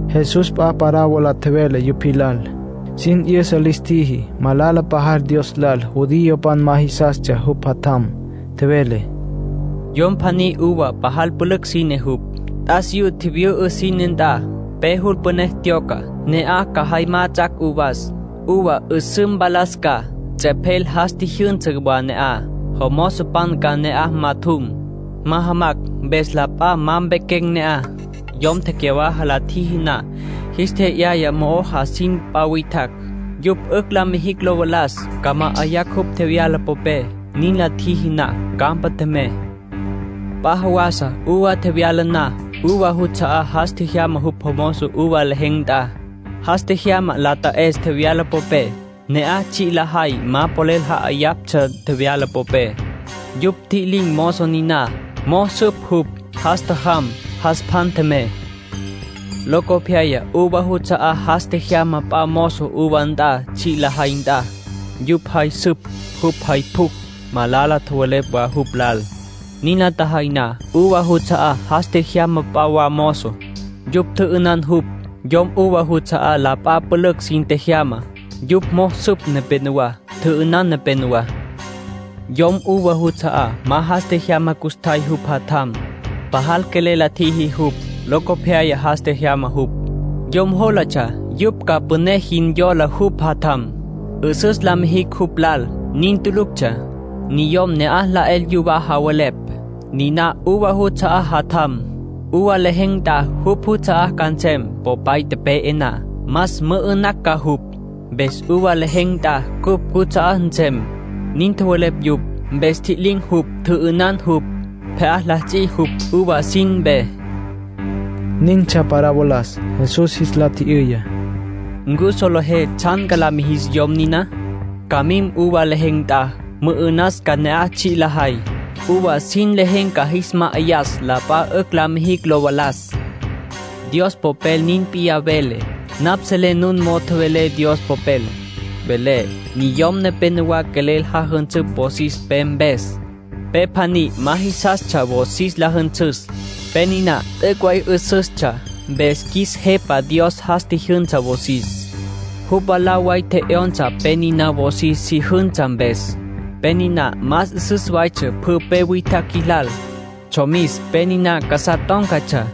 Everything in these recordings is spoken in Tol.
Jesús p'a parábola tjevele yupj jilal. Sin 'yüsa lis tjiji malala pajal Dios lal judiopan ma jisastsja jupj Jatjam. Tjevele: “Yom pjaní uva pajal pülücj sine jupj. T'asiyú tjivyü'ü sine nt'a. Pe jul püné tyoca, ca ne'aj jay majatsjacj uvas, uva 'üsǘ mpalas ca. Ts'epjel jas tjijyünsa wa ne'aj, jomozopan ca ne'aj majatjum, majamacj, mpes la p'a ma mpequen̈ ne'aj. Yom tecyawaja la tjiji na, jis tje'yaya mo'o jasin p'a witjacj. Yupj 'ücj la mijicj lo valas, ca ma'ayacj jupj tjevyala popé. Nin la tjiji na, campa tjemey. ”P'a jawasa uva tjevyala na, uva juts'a'á jas tjejyama jupj mozo uva lejen̈ nt'a. Jas tjejyama la ta'es tjevyala popé. Ne'aj tsji' lajay ma quelel ja'ayaptsja tjevyala popé. Yupj ntji'lin̈ mozo niná, mo'o süp jupj. Jas tjajam, jas pjan tjemey. Locopyaya uva juts'a'á jas tjejyama p'a mozo uva nt'a tsji' lajay nt'a. Yupj jay süp jupj jay pjucj, malala tjowelepj wa jupj lal. Nin la tjajay na, uva juts'a'á jas tjejyama p'a wa mozo. Yupj tjü'ünan jupj. Yom uva juts'a'á la p'a pülücj sin tjejyama. Yupj süp nepenowá. Tjü'ünan nepenowá. ”Yom uva juts'a'á ma jas tjejyama custjay jupj jatjam. Pajal quelel la tjiji jupj. Locopyaya jas tjejyama jupj. Yom jólatsja yupj ca püné jin yola jupj jatjam, 'üsüs la mijicj jupj lal. Nin tuluctsja. Niyom ne'aj la 'el yuwá tjowelepj: ‘Niná uva juts'a'á jatjam. Uva lejen̈ nt'a jupj juts'a'á ca nsem, popay tepe'e na. Mas, mü'ü'nacj ca jupj. Mpes uva lejen̈ nt'a cupj cuts'a'á nsem’, nin tjowelepj yupj. Mpes ntji'lin̈ jupj. Tjü'ünan jupj. Pje'á la ts'i jupj uva sin mpe”, nintsja parabolas. Jesús jis la tji'yüya: “¿Ncu solejé tsjan la mijis yom niná? Ca mim uva lejen̈ nt'a, mü'ü'nas ca ne'aj tsji' lajay. Uva sin lejen̈ ca jis ma'ayas la p'a 'ücj la mijicj lo valas. Dios Popel nin p'iyá vele. Napj selé nun mo'o tjowelé Dios Popel. Vele: ‘Niyom nepénowa quelel jajünsüptsja wosis pe mpes. Pe pjaní ma jisastsja wosis la jünsüs. Pe niná t'üc' way 'üsüstsja. Mpes qjuis Jepa Dios jas tjijyünsa wosis. Jupj mwalá way tje'yonsa pe niná wosis si jünsa mpes. Pe niná más 'üsüs waytsja pjü pe witjacj jilal. Tsjomis pe niná casá tón̈catsja.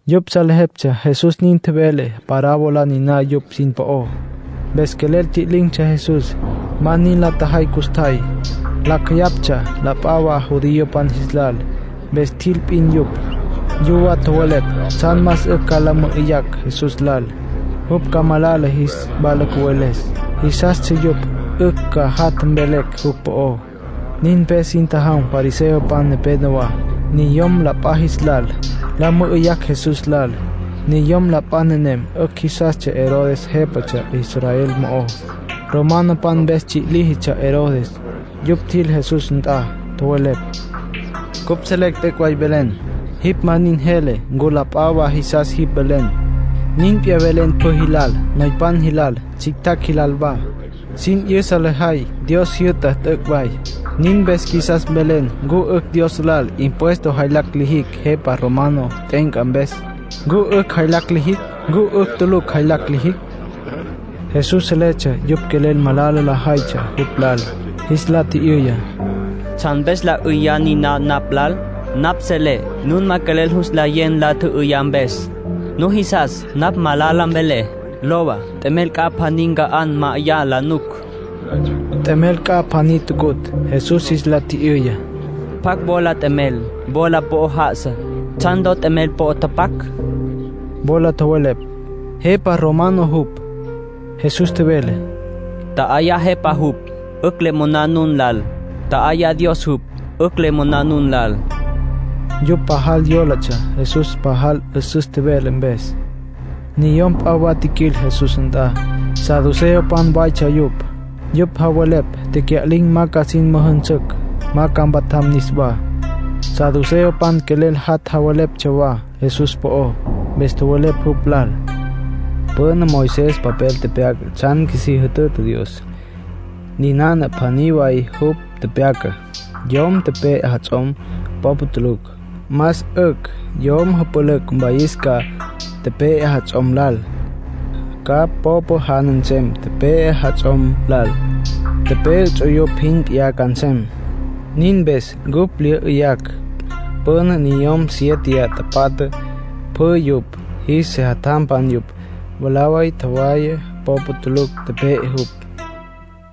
Yupj salejeptsja Jesús nin tjevele parábola niná yupj sin po'ó. Mpes quelel tji'lin̈tsja Jesús. Ma nin la tjajay custjay. Lacj jeyaptsja la p'a wa judiopan jis lal. Mpes tjil p'in yupj. Yuwá tjowelepj tsjan más 'ücj ca la mü'üyacj Jesús lal, jupj ca malala jis wala cüveles. Jisastsja yupj 'ücj ca jat' mvelecj jupj po'ó. Nin mpes sin tjajam fariseopan nepenowá, niyom la p'a jis lal, la mü'üyacj Jesús lal. Niyom la p'a nenem 'ücj jisastsja Herodes jépatsja Israel mo'ó. Romanopan mpes tsji' líjitsja Herodes. Yupj tjil Jesús nt'a. Tjowelepj: —Cupj selecj t'üc' way velen. Jipj ma nin jele ncu la p'a wa jisas jipj velen. Nin p'iyá velen pjü jilal, noypan jilal, tsjictjacj jilal wa. Sin 'yüsa lejay Dios jyü'tá t'üc' way. Nin mpes qjuisas mvelen ncu 'ücj Dios lal impuesto jaylacj lijicj jepa romano t'e'enca mpes. ¿Ncu 'ücj jaylacj lijicj? ¿Ncu 'ücj tulucj jaylacj lijicj? Jesús seletsja yupj quelel malala lajaytsja jupj lal. Jis la tji'yüya: —¿Tsjan mpes nla 'üyá niná napj lal? Napj selé nun ma quelel jus nlayé nla tjü'üyá mpes. Nujisas napj malala mvelé. Lowa, t'emel c'a pjaní nca'á ma 'ayá la nuc. T'emel c'a pjaní tucutj. Jesús jis la tji'yüya: —¿Pjacj wola t'emel wola po'ó já'asa? ¿Tsjan ló t'emel po'ó tapac? Wola tjowelepj: —Jepa romano jupj. Jesús tjevele: —Tja'ayá jepá jupj 'ücj le moná nun lal. Tja'ayá Dios jupj 'ücj le moná nun lal. Yupj pajal yólatsja Jesús pajal 'üsüs tjevele mpes. Niyom p'a wa tjiquil Jesús nt'a. Saduceopan waytsja yupj. Yupj javelepj tecya'lin̈ ma ca sin müjünsücj, ma ca mpatjam niswá. Saduceopan quelel jat' la velestsja wa Jesús po'ó, mpes tjowelepj jupj lal: —Püna Moisés papel tepyaca tsjan qjuisí jütüta Dios. Ninana pjaní way jupj tepyacá: yom pe'e jats'om popa tulucj, más 'ücj yom jüpülücj mwayis ca tepe'e jats'om lal. Ca popa jana nsem tepe'e jats'om lal. Tepe'e ts'uyupj jin p'iyá ca nsem. ”Nin mpes cupj lya 'yüyacj. Püna niyom siéteya tapatja, pjü yupj jis sejatjampan yupj. Mwalá way tjowaya, popa tulucj tepe'e jupj.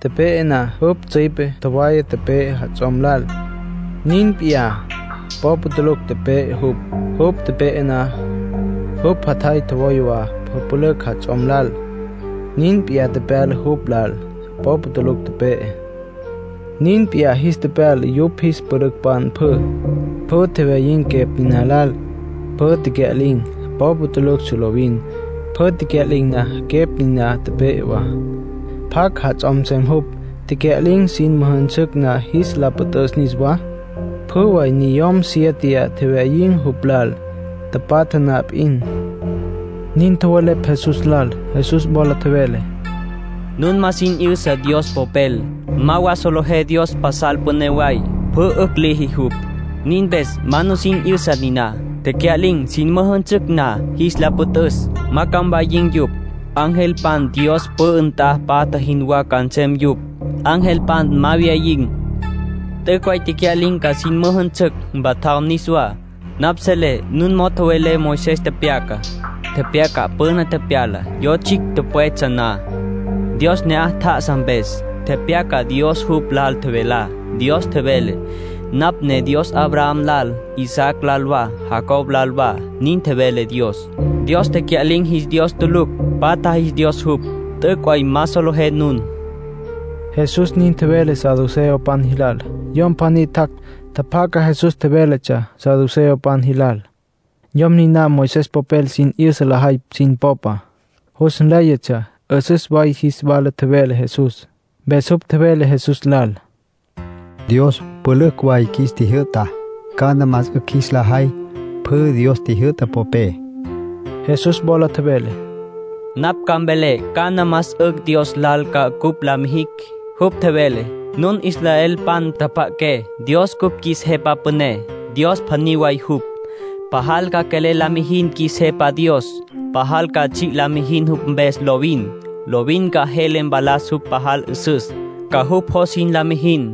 Tepe'e na, jupj tsüipe tjowaya tepe'e jats'om lal. Nin p'iyá popa tulucj tepe'e jupj. Jupj tepe'e na, jupj jatjay tjowaya wa jüpülücj jats'om lal. Nin p'iyá tepyala jupj lal. Popa tulucj tepe'e. Nin p'iyá jis tepyala yupj jis pülücpan pjü. Pjü tjewyayin̈ quepj niná lal. Pjü tecya'lin̈. Popa tuluctsja lovin. Pjü tecya'lin̈ na, quepj niná tepe'e wa. ”¿Pjacj jats'om nsem jupj, tecya'lin̈ sin müjünsücj na jis la püt'üs niswá? Pjü way niyom siéteya tjewyayin̈ jupj lal, tapatja na p'in —nin tjowelepj Jesús lal. Jesús wola tjevele: —Nun ma nusin 'yüsa Dios Popel. Ma wa solejé Dios pasal püné way, pjü 'ücj liji jupj. Nin mpes ma nusin 'yüsa niná. Tecya'lin̈ sin müjünsücj na jis la püt'üs, ma ca mwayin̈ yupj. Angelpan Dios pü'ü nt'a patja jinwá ca nsem yupj. Angelpan ma wyayin̈. ”T'üc' way tecya'lin̈ ca sin müjünsücj, mpatjam niswá. Napj selé nun mo'o tjowelé Moisés tepyacá. Tepyaca püna tepyalá, yo tsjicj pwetsja na, Dios ne'aj tjá'asa mpes. Tepyaca Dios jupj lal tjevelá. Dios tjevele: ‘Napj ne Dios Abraham lal, Isaac lal wa, Jacob lal wa’, nin tjevele Dios. Dios tecya'lin̈ jis Dios tulucj. Patja jis Dios jupj. T'üc' way ma solejé nun —Jesús nin tjevele saduceopan jilal. Yom pjaní tjac', tjapjaca Jesús tjevéletsja saduceopan jilal. Yom niná Moisés popel sin 'yüsa lajay sin popa. Jus nléyatsja 'üsüs way jis wala tjevele Jesús. Mpes jupj tjevele Jesús lal: —Dios pülücj way qjuis tjijyü'ta. ¿Cana más 'ücj jis la jay pjü Dios tjijyü'tá popé? Jesús wola tjevele: —Napj ca mvelé cana más 'ücj Dios lal ca cupj la mijicj. Jupj tjevele: ‘Nun israelpan, tjapja'aqué. Dios cupj qjuis Jepa Püné. Dios pjaní way jupj. Pajal ca quelel la mijin qjuis Jepa Dios. Pajal ca tsji' la mijin jupj mpes lovin. Lovin ca jele mpalas jupj pajal 'üsüs. Ca jupj jos jin la mijin.’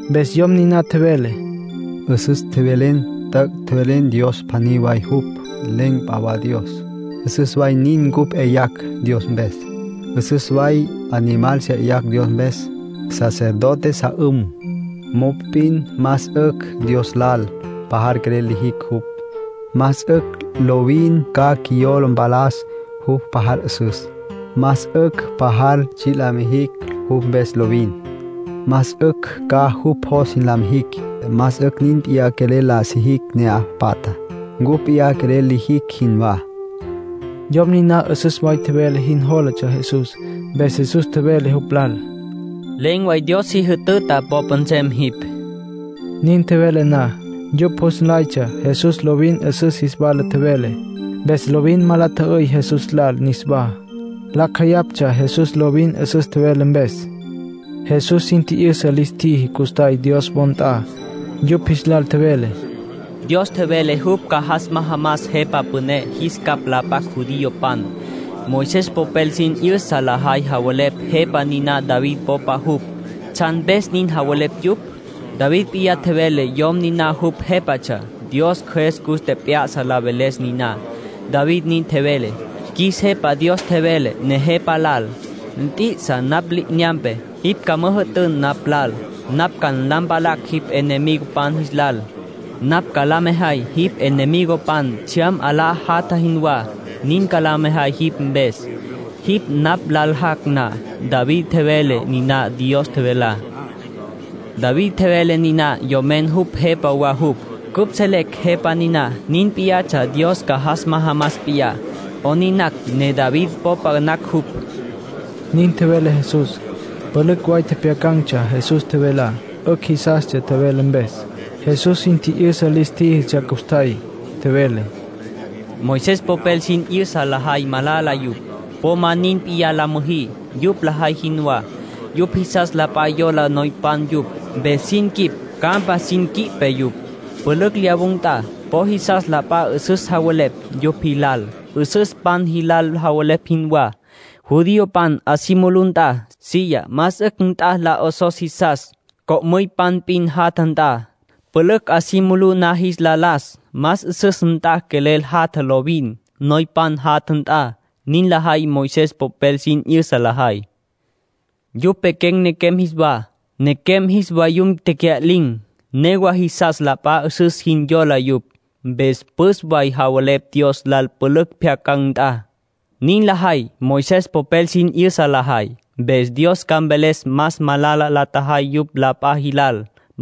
Mpes yom niná tjevele: —'Üsüs tjevelen. T'üc' tjevelen Dios pjaní way jupj. Len̈ p'a wa Dios. 'Üsüs way nin, cupj 'yayacj Dios mpes. 'Üsüs way animal 'yayacj Dios mpes, sacerdote sa 'üm. Mop'in más 'ücj Dios lal pajal quelel lijicj jupj. Más 'ücj lovin ca qjuiyola mpalas jupj pajal 'üsüs. Más 'ücj pajal tsji' la mijicj jupj mpes lovin. Más 'ücj ca jupj jos jin la mijicj. Más 'ücj nin p'iyá quelel la sijicj ne'aj patjá, cupj p'iyá quelel lijicj jinwá. Yom niná 'üsüs way tjevele jin jólatsja Jesús. Mpes Jesús tjevele jupj lal: —Len̈ way Dios si jütüta popa nsem jipj —nin tjevele Jesús. Nin tjevele na, yupj jus nlaytsja Jesús lovin 'üsüs jis wala tjevele. Mpes lovin ma la tjü'üy Jesús lal niswá. Lacj jeyaptsja Jesús lovin 'üsüs tjevele mpes. Jesús sin tji'yüsa lis tjíjitsja custjay Dios wo nt'a. Yupj jis lal tjevele: —Dios tjevele jupj ca jas majamas Jepa Püné jis capj la p'acj judiopan. Moisés popel sin 'yüsa lajay javelepj Jepa niná David popa jupj. ¿Tsjan mpes nin javelepj yupj? David p'iyá tjevele yom niná jupj Jépatsja. Dios Cjües cus tjep'ya'sa la veles niná. David nin tjevele: ‘Qjuis Jepa Dios tjevele Nejepa lal: “Nt'i'isa napj li'inyampe. Jipj ca müjü'tün napj lal. Napj ca la mpalan jipj enemigopan jis lal. Napj ca la mejay jipj enemigopan tsjyam 'alá jatja jinwá. Nin ca la mejay jipj mpes, jipj napj lal jac' na.” ’ David tjevele niná Dios tjevelá. David tjevele niná yomen jupj Jepa wa jupj. Cupj selecj Jepa niná nin p'iyatsja Dios ca jas majamas p'iyá. ¿'Onin nacj ne David popa nacj jupj? —nin tjevele Jesús. Pülücj way tjepjyacan̈tsja Jesús tjevelá. 'Ücj jisastsja tjevele mpes. Jesús sin tji'yüsa lis tjíjitsja custjay. Tjevele: “Moisés popel sin 'yüsa lajay malala yupj. Po ma nin p'iyá la müjí, yupj lajay jinwá. Yupj jisas la p'a yola noypan yupj, mpes sin quip campa sin quipe yupj. Pülücj lyawun̈ nt'a po jisas la p'a 'üsüs javelepj yupj jilal, 'üsüspan jilal javelepj jinwá. Judiopan 'a si mulú nt'a, silla más 'ücj nt'a la 'osos jisas, cocoypan p'in jatja nt'a. Pülücj 'a si mulú na jis la las, más 'üsüs nt'a quelel jatja lovin, noypan jatja nt'a. Nin lajay Moisés popel sin 'yüsa lajay. Yupj pequen̈ nequem jis wa, nequem jis vayum tecya'lin̈. Newa jisas la p'a 'üsüs jin yola yupj. Mpes püs way javelepj Dios lal pülücj pjyacan̈ nt'a. Nin lajay Moisés popel sin 'yüsa lajay, mpes Dios ca mveles más malala la tjajay yupj la p'a jilal.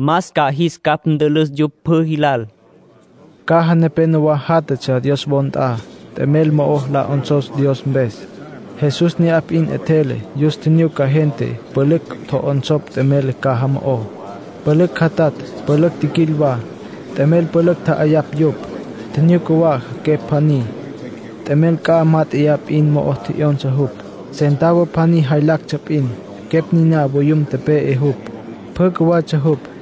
Más ca jis capj ntülüs yupj pjü jilal”, nin tjevele Jesús. Caja nepénowa játjatsja Dios wo nt'a, t'emel mo'o la 'onsos Dios mpes. Jesús ne'aj p'in 'etjele, yus tjinyuca gente pülücj tjo'onsopj t'emel caja mo'ó. Pülücj jatatj pülücj tjiquil wa, t'emel pülücj tja'ayapj yupj. Tjinyuca wa quepj pjaní, t'emel c'a mát'eya p'in mo'o tje'yonsa jupj. Centavo pjaní jaylactsja p'in. Quepj niná voyum tepe'e jupj. Pjü cjuwatsja jupj.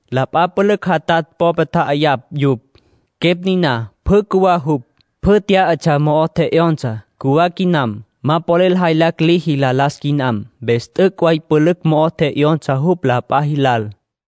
La p'a pülücj jatatj popé tja'ayapj yupj. Quepj niná pjü cjuwá jupj. Pjü tyá'atsja mo'o tje'yonsa. Cjuwá quinam. Ma polel jaylacj liji la las quinam. Mpes t'üc' way pülücj mo'o tje'yonsa jupj la p'a jilal.”